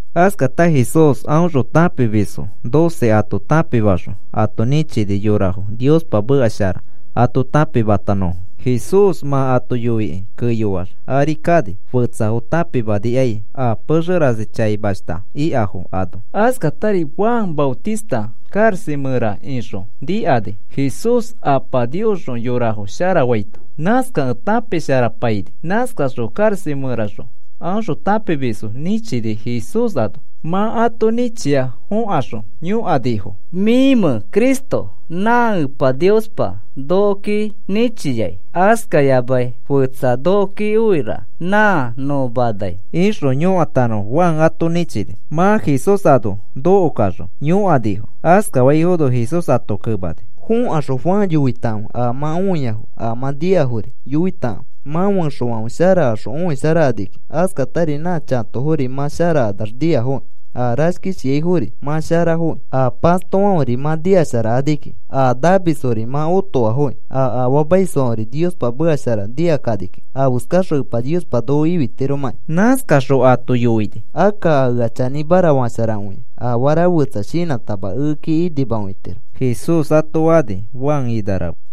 Askata Jesús aõxõ tãpimisfo doce ato tãpimaxõ ato nĩchini yorafo Niospa meka shara ato tãpimatanõfo. Jesús mã ato yoikĩ keyoax ari kani, fetsafo tãpimanikai a pexe rasi chaimashta ikafo ano. Askatari Juan Maotista karaxa mẽra ixõ nikani Jesús Apa Niosxõ yorafo sharafaito. Nãskakẽ tãpisharapaini. Nãskaxõ karaxa mẽraxõ aõxõ tãpimisfo nĩchini Jesús ano. Mã ato nĩchia fõkaxõ yõkanifo: “¿Mĩmẽ Cristo nã Epa Niospa nokoki nĩchiai, askayamai fetsa nokoki oiraka nã nõ manai?” ixõ yõkatanõfo Juan ato nĩchini. Mã Jesús ano nokokaxõ yõkanifo. Askafaifono Jesús ato kemani: “Fokaxõ Juan yoitakãfe a mã õiyanã a mã nikafori. Yoitakãfe, mã fẽxofãfe sharakaxõ õisharakani kiki, askatari nã chatofori mã sharakanax niafoki, a rashkishiaifori mã sharafokĩ, a pastofãferi mã nikasharakani kiki, a namisfori mã otoafoki, a afaamaisfãferi Niospa meka shara nikakani kiki afeskaxõ Epa Niospa noko ifitiromakĩ.” Nãskaxõ ato yoini: “Akka a ea chanĩmara fasharakõia afara fetsa shinãtama ekeki inimakõitiro,” Jesús ato fani, Juan ina rafe.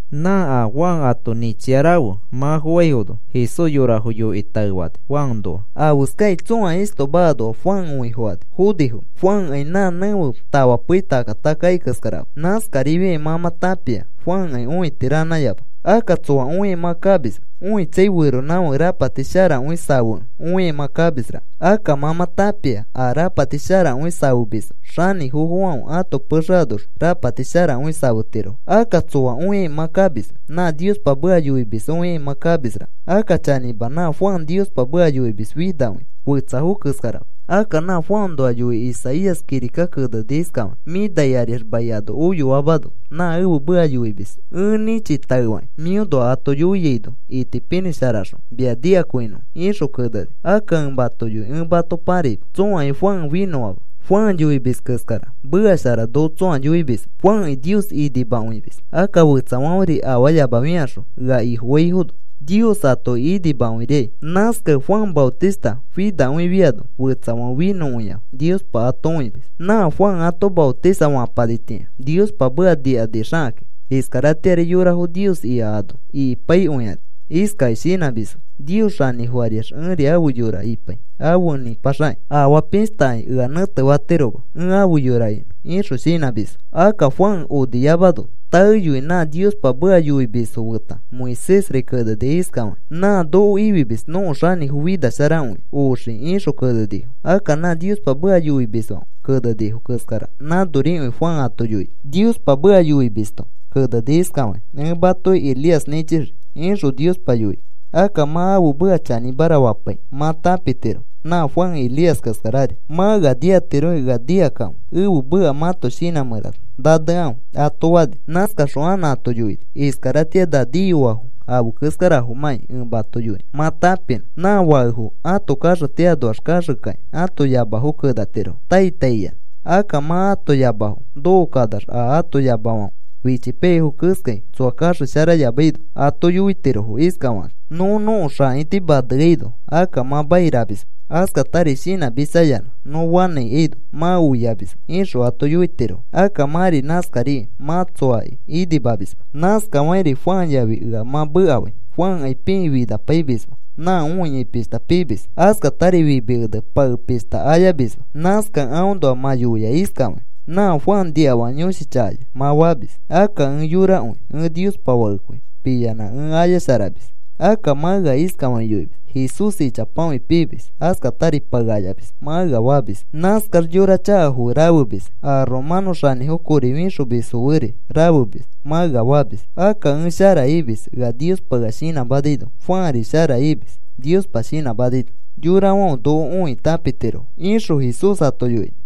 Nã a Juan ato nĩchia rafe mã foaifono Jesús yorafo yoikĩ taefani Juanoa. “¿Afeskakĩ tsõa istoma anoa Juan õifokani fonifomẽ? Juankai nã nẽfe tafa pei taka taka akai keskarama. Nãskarifiakĩ mã mã tãpia Juankai õiti ranãyama. Akka, ¿tsoa õikai mã kamismẽ? Õitsai, feronãfake rapati sharakõi safekẽ õikai mã kamisraka. Akka mã mã tãpia a rapati sharakõi safemisfo xanĩfofofãfe ãto pexe anoxõ rapati sharakõi safetirofo. Akka, ¿tsoa õikai mã kamismẽ? Nã Niospa meka yoimis õikai mã kamisraka. Akka chanĩma, nã Juan Niospa meka yoimis finakõia, fetsafo keskarama. Akka nã Juanoa yoikĩ Isaías kirika keneni iskafakĩ: Mĩ nai ariax mai ano oyoamano, nã ẽfe meka yoimis ẽ nĩchi taefakĩ mĩonoa ato yoiaino itipinĩ sharakaxõ mia nikakõinõfo, ixõ keneni. Akka ẽ mato yoi ẽ mato paraima. Tsõakai Juan finõama. Juan yoimis keskara meka shara noko tsõa yoimisma. Juanki Nios inimakõimis. Akka fetsafãferi afaayamafikaxõ ea Ifofaifono Nios atoki inimakõirikai. Nãskakẽ Juan Maotista finakõifiano fetsafãfe finõkõiafo Niospa ato õimis. “Nã Juan ato matotisa fapanitĩa Niospa meka nikanixakakĩ, iskaratĩari yorafo Nios ika ano ikipaikõikani. Iskakĩ shinãmisfo; ‘Nios xanĩfo ariax ẽri ãfe yora ipai afe nĩpaxakĩ. Afaa pishtakai ea nẽtefatiroma ẽ ãfe yora inõ,’ ixõ shinãmisfo. Akka Juan oniyamano taeyoi nã Niospa meka yoimisfo feta Moisésri keneni iskafakĩ: ‘Nã noko ifimis nõko Xanĩfo finasharakõi oxii,’ ixõ kenenifo. Akka nã Niospa meka yoimisfãfe kenenifo keskara nãnorikõi Juan ato yoini. Niospa meka yoimisto keneni iskafakĩ: ‘Ẽ matoki Elías nĩchixii,’ ixõ Niospa yoini. Akka mã ãfe meka chanĩmara fapaikĩ mã tãpitiro nã Juan Elías keskarari. Mã ea nikatirokĩ ea nikakãfe. Ẽfe meka mãto shinã mẽra nanekãfe,” ato fani. Nãskaxõ anã ato yoini: “Iskaratĩa na niyoafo afe keskarafomãki ẽ mato yoinõ mã tãpinõ. Nã fakefo ãto kaxeti anoax kaxekakĩ ãto yamafo kenatirofo tai tai iyanã. Akka mã ãto yamafo nokokanax a ato yamafãfe fichipaiyaifo keskai tsoa kaxesharayamaino ato yoitirofo iskafakakĩ: ‘Nõ nõko xãiti maneaino akka mã mairamisma. Askatari shinãmitsayanã nõ fanãikaino mã oiamisma,’ ixõ ato yoitirofo. Akka mãri nãskariai mã tsoaki inimamisma. Nãskafakĩri Juan yafi ea mã mekafai. Juankai pikĩ finapaimisma nã õiai pishta pimis, askatari fimi ene pae pishta ayamisma. Nãskakẽ aõnoa mã yoia iskafakĩ: ‘Nã Juan niafaka yõshi chakaya,’ mã famis. Akka ẽ yorakõi ẽ Niospa Fakekõi piyanã ẽ ayasharamis. Akka mã ea iskafakĩ yoimis: ‘Jesús ichapakõi piimis, askatari pae ayamis,’ mã ea famis. ‘Nãskax yora chakafo fe rafemis, a romanõ xanĩfo kori fixomisfo feri rafemis,’ mã ea famis. Akka ẽ shara imis ea Niospa ea shinãmanaino. Juanri shara imis Niospa shinãmanaino. Yorafãfe noko õikĩ tãpitirofo,” ixõ Jesús ato yoini.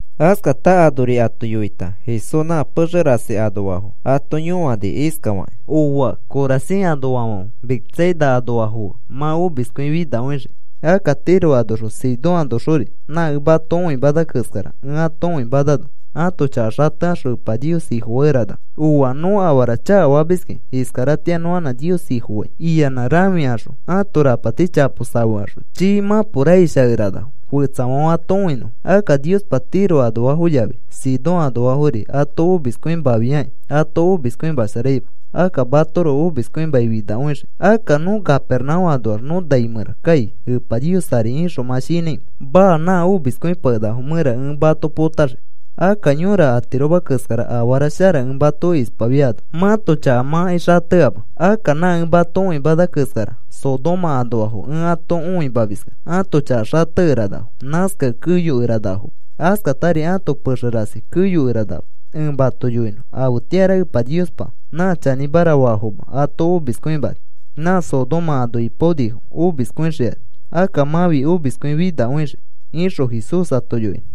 Askata anori ato yoita Jesús nã pexe rasi anoafo ato yõani iskafakĩ: “Ooa, Corazin anoafãfe Betsaida anoafo fe, mã omiskõi finakõixii. Akka Tiro anoxõ Sidón anoxori nã ẽ mato õimana keskara, ẽ ato õimanano ãto chaka xatekaxõ Epa Nios Ifofakeranafo. ‘Ooa, nõ afara chakafamiskĩ iskaratĩa nõ anã Nios Ifofai,’ iyanã rãfikaxõ ãto rapati chapo safekaxõ chii mãpo raish akeranafo fetsafãfe ato õinõfo. Akka Niospa Tiro anoafo yafi Sidón anoafori ato omiskõimafiakĩ ato omiskõimasharaima, akka matoroko omiskõimakĩ finakõixii. Akka, ¿nõ Capernaúm anoax nõ nai mẽra kai Epa Nios ari ixõ mã shinãimẽ? Maa. Nã omiskõipakenakafo mẽra ẽ mato potaxii. Akka yõra atiroma keskara afara shara ẽ mato ispafiano mãto chaka mãkai xateama. Akka nã ẽ mato õimana keskara Sodoma anoafo ẽ ato õimamiskẽ ãto chaka xatekeranafo. Nãskakẽ keyokeranafoma. Askatari ãto pexefã rasi keyokeranama. Ẽ mato yoinõ. Afetĩara Epa Niospa nã chanĩmara faafoma ato omiskõimani. Nã Sodoma ano ipaonifo omiskõixikani. Akka mãfi omiskõi finakõixii,” ixõ Jesús ato yoini.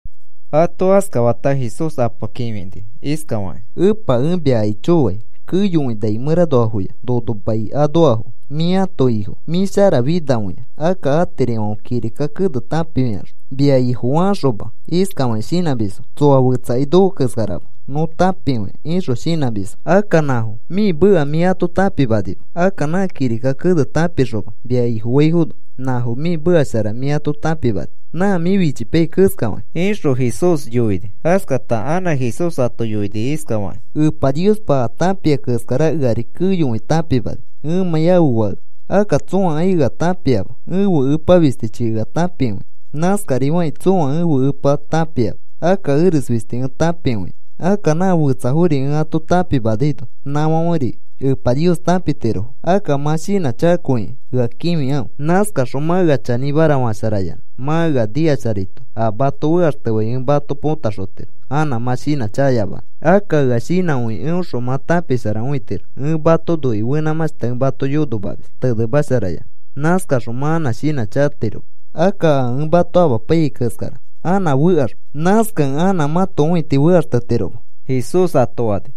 Ato askafata Jesús Apa kĩfini iskafakĩ: “Epa, ẽ mia aicho fai. Keyokõi nai mẽranoafoya nono mai anoafo mĩ ãto Ifo. Mĩ sharafinakõi. Akka atirifãfe kirika kene tãpifikaxõ mia Ifofakaxoma. Iskafakĩ shinãmisfo: ‘Tsoa fetsakai noko keskarama. Nõ tãpikõia,’ ixõ shinãmisfo. Akka nãfo mĩ meka mĩ ato tãpimanima. Akka nã kirika kene tãpikaxoma, mia Ifofaifono nãfo mĩ meka shara mĩ ato tãpimani, nã mĩ fichipaiyai keskafakĩ,” ixõ Jesús yoini. Askata anã Jesús ato yoini iskafakĩ: “Epa Niospa a tãpia keskara eari keyokõi tãpimani, ẽmãi ãfe Fakekẽ. Akka tsõakai ea tãpiama, ẽfe Epa fistichi ea tãpikõia. Nãskarifakĩ tsõa ẽfe Epa tãpiama, akka eres fisti ẽ tãpikõia. Akka nã fetsafori ẽ ato tãpimanaino nãfãferi Epa Nios tãpitirofo. Akka mã shinãchakakõikĩ ea kĩfikãfe. Nãskaxõ mã ea chanĩmara fasharayanã mã ea nikasharaito a mato fekaxtefai ẽ mato potaxotiro anã mã shinãchakayamanõ. Akka ea shinãkõikĩ eõxõ mã tãpisharakõitiro. Ẽ mato noikĩ fenãmãshta ẽ mato yonomamis tenemasharayanã. Nãskaxõ mã anã shinãchakatiroma. Akka a ẽ mato amapaiyai keskara anã fekaxma. Nãskakẽ anã mãto õiti fekaxtetiroma,” Jesús ato fani.